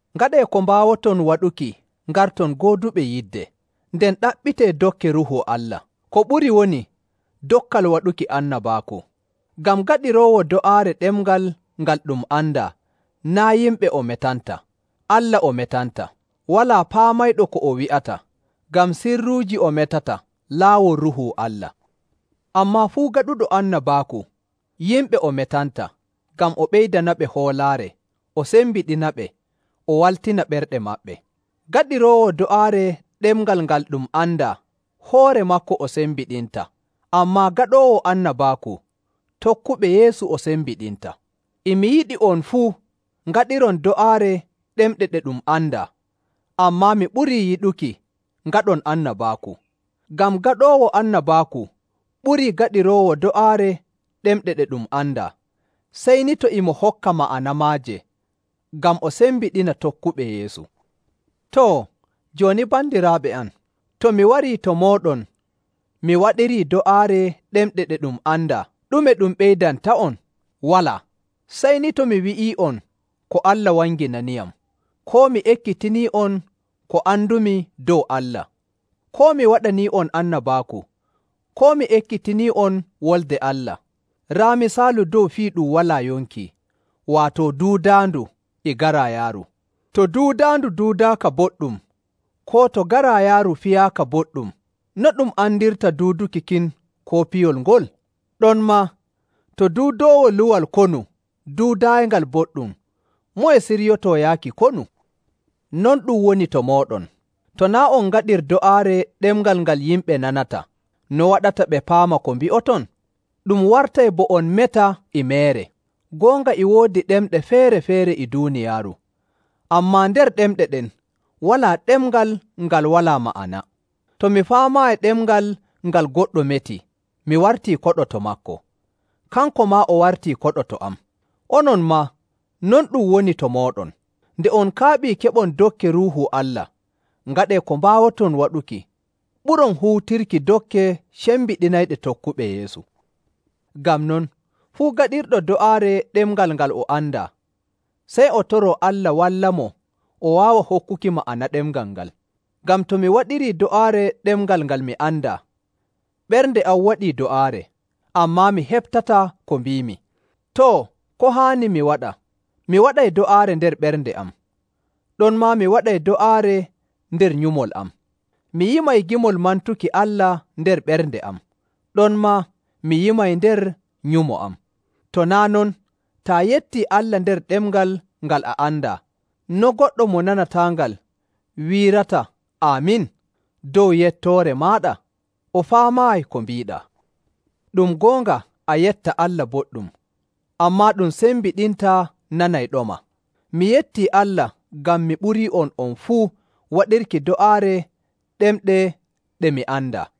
Ngaɗee ko mbaawoton waɗuki ngarton gooduɓe yidde, nden ɗaɓɓitee dokke Ruuhu Allah, ko ɓuri woni dokkal waɗuki annabaaku. Ngam gaɗiroowo do'aare ɗemngal ngal ɗum andaa naa' yimɓe o metanta, Allah o metanta. Walaa paamayɗo ko o wi'ata, ngam sirruuji o metata laawol Ruuhu Allah. Ammaa fuu gaɗuɗo annabaaku, yimɓe o metanta, ngam o ɓeydanaɓe hoolaare, o sembiɗinaɓe, o waltina ɓerɗe maɓɓe. Gaɗiroowo do'aare ɗemngal ngal ɗum andaa hoore maako o sembiɗinta, ammaa gaɗoowo annabaaku, tokkuɓe Yeesu o sembiɗinta. E mi yiɗi on fuu ngaɗiron do'aare ɗemɗe ɗe ɗum andaa, ammaa mi ɓurii yiɗuki ngaɗon annabaaku. Ngam gaɗoowo annabaaku ɓurii gaɗiroowo do'aare ɗemɗe ɗe ɗum andaa, sey ni to e mo hokka ma'ana maaje, ngam o sembiɗina tokkuɓe Yeesu. Too, jooni bandiraaɓe am, to mi warii to mooɗon mi waɗirii do'aare ɗemɗe ɗe ɗum andaa, ɗume ɗum ɓeydanta'on? Walaa! Sey ni to mi wi'ii'on ko Allah wanginaniyam, koo mi ekkitinii'on ko andumi dow Allah, koo mi waɗanii'on annabaaku, koo mi ekkitinii'on Wolde Allah. Raa misaalu dow fii ɗum walaa yonki, waato duudaandu e garaayaaru. To duudaandu duudaaka boɗɗum koo to garaayaaru piyaaka boɗɗum, no ɗum andirta duuduki kin koo piyol ngol? Ɗonmaa, to duudoowo luwal konu duudaayingal boɗɗum, moye siryotoo yaaki konu? Non ɗum woni to mooɗon, to naa' on ngaɗir do'aare ɗemngal ngal yimɓe nanata, no waɗata ɓe paama ko mbi'oton? Ɗum wartay bo on meta e meere. Goonga, e woodi ɗemɗe feere‑feere e duuniyaaru, ammaa nder ɗemɗe ɗen walaa ɗemngal ngal walaa ma'ana. To mi faamaayi ɗemngal ngal goɗɗo meti, mi wartii koɗo to maako, kanko maa o wartii koɗo to am. Onon maa, non ɗum woni to mooɗon. Nde on kaaɓii keɓon dokke Ruuhu Allah, ngaɗee ko mbaawoton waɗuki ɓuron huutirki dokke cembiɗinayɗe tokkuɓe Yeesu. Ngam non, fuu gaɗirɗo do'aare ɗemngal ngal o andaa, sey o toroo Allah wallamo o waawa hokkuki ma'ana ɗemngal ngal. Ngam to mi waɗirii do'aare ɗemngal ngal mi andaa, ɓernde am waɗii do'aare, ammaa mi heɓtataa ko mbiimi. Too, ko haani mi waɗa? Mi waɗay do'aare nder ɓernde am, ɗonmaa mi waɗay do'aare nder nyumol am. Mi yimay gimol mantuki Allah nder ɓernde am, ɗonmaa mi yimay nder nyumo am. To naa' non, taa yettii Allah nder ɗemngal ngal a andaa, no goɗɗo mo nanataangal wiirata “Aamin” dow yettoore maaɗa? O faamaayi ko mbiiɗaa. Ɗum goonga a yetta Allah boɗɗum, ammaa ɗum sembiɗintaa nanayɗoma. Mi yettii Allah ngam mi ɓurii'on on fuu waɗirki do'aare ɗemɗe ɗe mi andaa.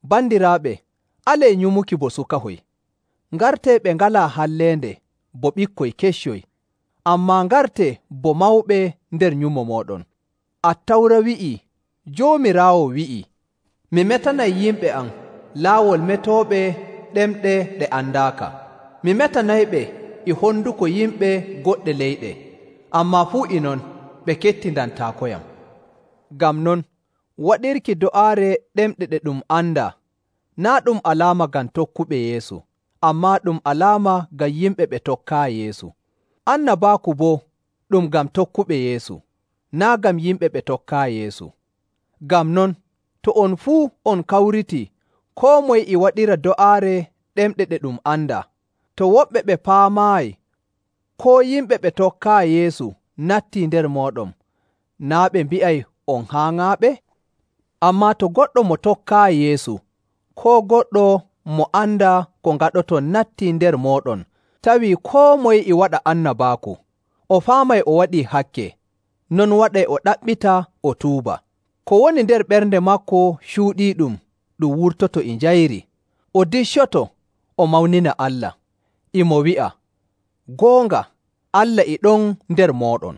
Bandiraaɓe, alee nyumuki bo sukahoy. Ngartee ɓe ngalaa halleende bo ɓikkoy keccoy, ammaa ngartee bo mawɓe nder nyumo mooɗon. Attawra wi'ii Joomiraawo wi'ii, “Mi metanay yimɓe am laawol metooɓe ɗemɗe ɗe andaaka. Mi metanayɓe e honduko yimɓe goɗɗe leyɗe, ammaa fuu e non ɓe kettindantaakoyam.” Ngam non, waɗirki do'aare ɗemɗe ɗe ɗum andaa naa' ɗum alaama ngam tokkuɓe Yeesu, ammaa ɗum alaama ngam yimɓe ɓe tokkaayi Yeesu. Annabaaku boo ɗum ngam tokkuɓe Yeesu, naa' ngam yimɓe ɓe tokkaayi Yeesu. Ngam non, to on fuu on kawritii koo moye e waɗira do'aare ɗemɗe ɗe ɗum andaa, to woɓɓe ɓe paamaayi koo yimɓe ɓe tokkaayi Yeesu nattii nder mooɗon, naa' ɓe mbi'ay on haaŋaaɓe? Ammaa to goɗɗo mo tokkaayi Yeesu koo goɗɗo mo andaa ko ngaɗoton nattii nder mooɗon tawii koo moye e waɗa annabaaku, o faamay o waɗii hakke, non waɗay o ɗaɓɓita o tuuba. Ko woni nder ɓernde maako cuuɗiiɗum ɗum wurtoto e njayri, o diccoto, o mawnina Allah, e mo wi'a, “Goonga, Allah e ɗon nder mooɗon.”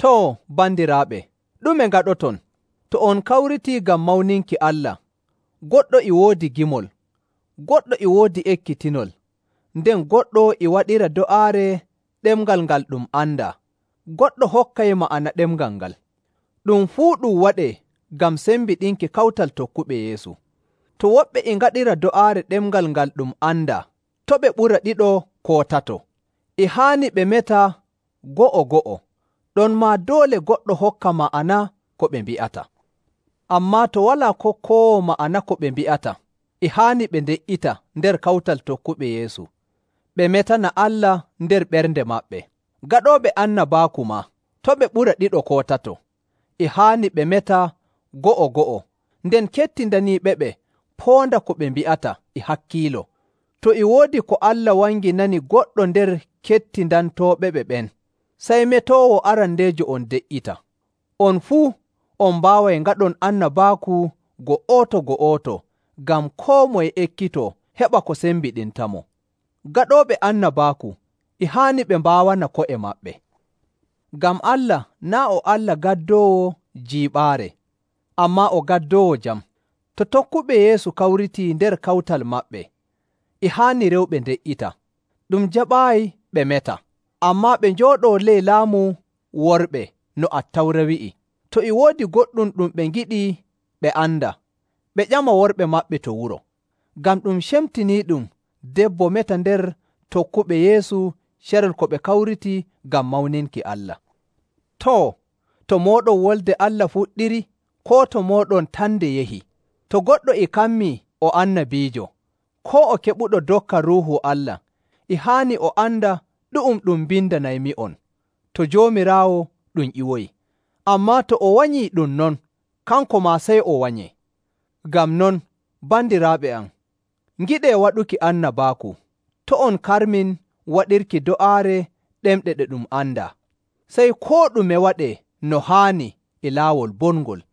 Too, bandiraaɓe, ɗume ngaɗoton? To on kawritii ngam mawninki Allah, goɗɗo e woodi gimol, goɗɗo e woodi ekkitinol, nden goɗɗo e waɗiray do'aare ɗemngal ngal ɗum andaa, goɗɗo hokkay ma'ana ɗemngal ngal. Ɗum fuu ɗum waɗee ngam sembiɗinki kawtal tokkuɓe Yeesu. To woɓɓe e ngaɗira do'aare ɗemngal ngal ɗum andaa, to' ɓe ɓura ɗiɗo koo tato. E haani ɓe meta go'o‑go'o, ɗonmaa doole goɗɗo hokka ma'ana ko ɓe mbi'ata. Ammaa to walaa kokkoowo ma'ana ko ɓe mbi'ata, e haani ɓe nde''ita nder kawtal tokkuɓe Yeesu, ɓe metana Allah nder ɓernde maɓɓe. Gaɗooɓe annabaaku maa, to' ɓe ɓura ɗiɗo koo tato. E haani ɓe meta go'o‑go'o, nden kettindaniiɓeɓe poonda ko ɓe mbi'ata e hakkiilo. To e woodi ko Allah wanginani goɗɗo nder kettindantooɓe ɓen, sey metoowo arandeejo on de''ita. On fuu on mbaaway ngaɗon annabaaku go'oto‑go'oto ngam koo moye ekkitoo heɓa ko sembiɗintamo. Gaɗooɓe annabaaku e haani ɓe mbaawana ko'e maɓɓe. Ngam Allah naa' o Allah gaddoowo jiiɓaare, ammaa o gaddoowo jam. To tokkuɓe Yeesu kawritii nder kawtal maɓɓe, e haani rewɓe nde''ita. Ɗum jaɓaayi ɓe meta, ammaa ɓe njooɗoo ley laamu worɓe no Attawra wi'i. To e woodi goɗɗum ɗum ɓe ngiɗi ɓe anda, ɓe ƴama worɓe maɓɓe to wuro. Ngam ɗum cemtiniiɗum debbo meta nder tokkuɓe Yeesu carel ko ɓe kawriti ngam mawninki Allah. Too, to mooɗon Wolde Allah fuɗɗiri, koo to mooɗon tan nde yahi? To goɗɗo e kammii o annabiijo, koo o keɓuɗo dokkal Ruuhu Allah, e haani o anda ɗu'um ɗum mbindanaymi'on to Joomiraawo ɗum ƴiwoyi. Ammaa to o wanyii ɗum non, kanko maa sey o wanyee. Ngam non, bandiraaɓe am, ngiɗee waɗuki annabaaku, to' on karmin waɗirki do'aare ɗemɗe ɗe ɗum andaa. Sey koo ɗume waɗee no haani e laawol bongol.